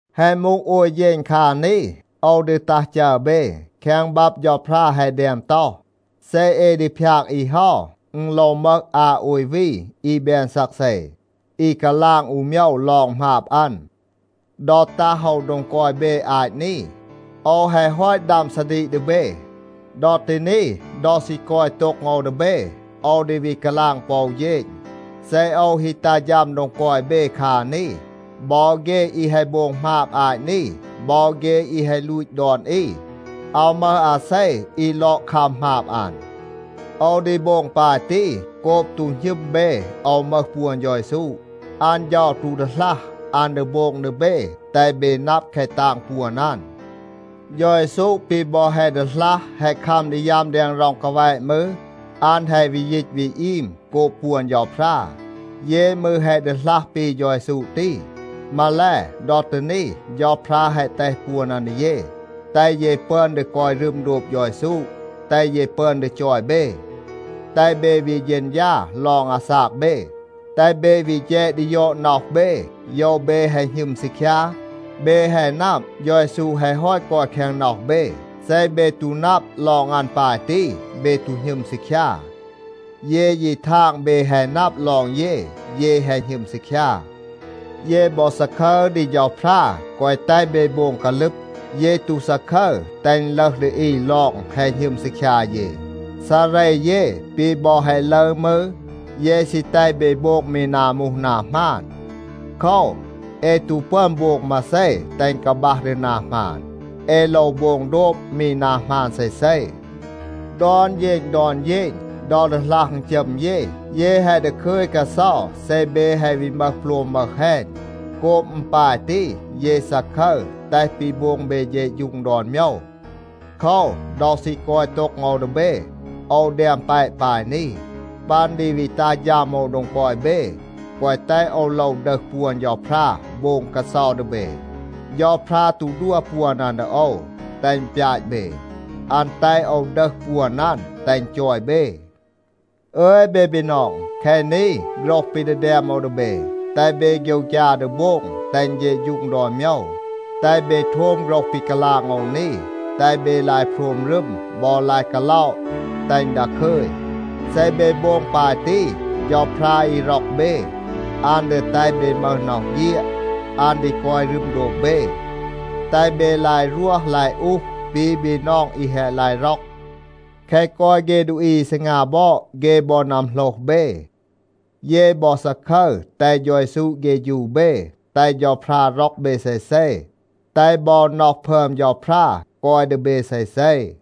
แฮะ มูห โอย เฌณ คา นี, โอว ดี ตัห จัร เบ. แคง บับ เฌาพรา แฮะ แดม ต็อห, “เซ เอ ดี พยาก อี เฮา, อึณ โลว มึห อา โอย วี อี แบน ซักเซ, อี กาลาง อู โมยว ลอง หมาบ อัน.” ดอ ตัห โอว โดง กอย เบ อาต นี, โอว แฮะ ฮอต ดัม ซาดีก ดี เบ. ดอ ตี นี, ดอ ซี กอย โต็ง โอว ดี เบ, โอว ดี วี กาลาง ปอ อู เฌณ, เซ โอว ฮี ตัห ฌัม โดง กอย เบ คา นี, บอ เฆ อี แฮะ โบง หมาบ อาต นี, บอ เฆ อี แฮะ ลูต ดอน อี, อาว มึห อาเซ อี ลอด คัม หมาบ อัน. โอว ดี โบง ปาย ตี โกบ ตู หณึม เบ โอว มึห ปวน เฌา เยซู. อัน เฌา ตู ดีหลัห, อัน ดี โบง ดี เบ แตห เบ นับ แคะ ตาง ปวน อัน. เฌา เยซู ปี บอ แฮะ ดีหลัห แฮะ คัม ดี ยัม แดง ร็อง กาแวะ มืร, อัน แฮะ วี ยีต วี อีม โกบ ปวน เฌาพรา. เย มืร แฮะ ดีหลัห ปี เฌา เยซู ตี. มาแล, ดอ ตี นี, เฌาพรา แฮะ แตห ปวน อัน ดี เย, แตห เย ปึอน ดี กอย รึม โดบ เฌา เยซู, แตห เย ปึอน ดี จอย เบ. แตห เบ วี เฌณฌา ลอง อาซาก เบ, แตห เบ วี แฌด ดี ยอด น็อห เบ, โยว เบ แฮะ หณึม ซีคยา. เบ แฮะ นับ, เฌา เยซู แฮะ ฮอต กอย แคง น็อห เบ. เซ เบ ตู นับ ลอง อัน ปาย ตี, เบ ตู หณึม ซีคยา. เย ยี ทาง เบ แฮะ นับ ลอง เย, เย แฮะ หณึม ซีคยา. เย บอ ซาคึร ดี เฌาพรา, แกวะ แตห เบ โบง กาลึบ. เย ตู ซาคึร, แตห อึณ ลึห ดี อี ลอง แฮะ หณึม ซีคยา เย. ซาเร เย ปี บอ แฮะ ลึร มืร, เย ซี แตห เบ โบง มี นา มูห นา หมาน. โคว, เอ ตู ปึอน โบง มาเซ แตห อึณ กาบัห ดี นา หมาน. เอ โลว โบง โดบ มี นา หมาน เซเซ. ดอน เฌณ ดอน เฌณ, ดอ ดีหลัห อึณจัม เย, เย แฮะ ดาคึย กาเซา เซ เบ แฮะ วี มึห โปลม มึห แฮณ. โกบ อึณ ปาย ตี, เย ซาคึร แตห ปี โบง เบ เฌะฌูง ดอน โมยว. โคว, ดอ ซี กอย โต็ง โอว ดี เบ, โอว แดม แปะ ปาย นี. ปัน ดี วี ตัห ฌัม โอว โดง กอย เบ, แกวะ แตห โอว โลว ดึห ปวน เฌาพรา โบง กาเซา ดี เบ. เฌาพรา ตู ดัว ปวน อัน ดี โอว, แตห อึณ ปยาต เบ. อัน แตห โอว ดึห ปวน อัน แตห อึณ จอย เบ. อึย เบ บีนอง, แคะ นี โฆรห ปี ดี แดม โอว ดี เบ. แตห เบ โฆยวฆยา ดี โบง, แตห อึณ เฌะฌูง ดอน โมยว. แตห เบ โทม โฆรห ปี กาลาง โอว นี. แตห เบ ลาย โพรม รึม บอ ลาย กาล็อะ, แตห อึณ ดาคึย. เซ เบ โบง ปาย ตี, เฌาพรา อี ร็อก เบ, อัน ดี แตห เบ มึห น็อห เฆียด. อัน ดี กอย รึม โดบ เบ. แตห เบ ลาย รวห ลาย อูห, ปี บีนอง อี แฮะ ลาย ร็อก. แคะ กอย เฆ ดูอี อี ซีงา บอด, เฆ บอ นัมโหลห เบ. เย บอ ซาคึร แตห เฌา เยซู เฆฌู เบ, แตห เฌาพรา ร็อก เบ เซเซ, แตห บอ น็อห พึอม เฌาพรา กอย ดี เบ เซเซ.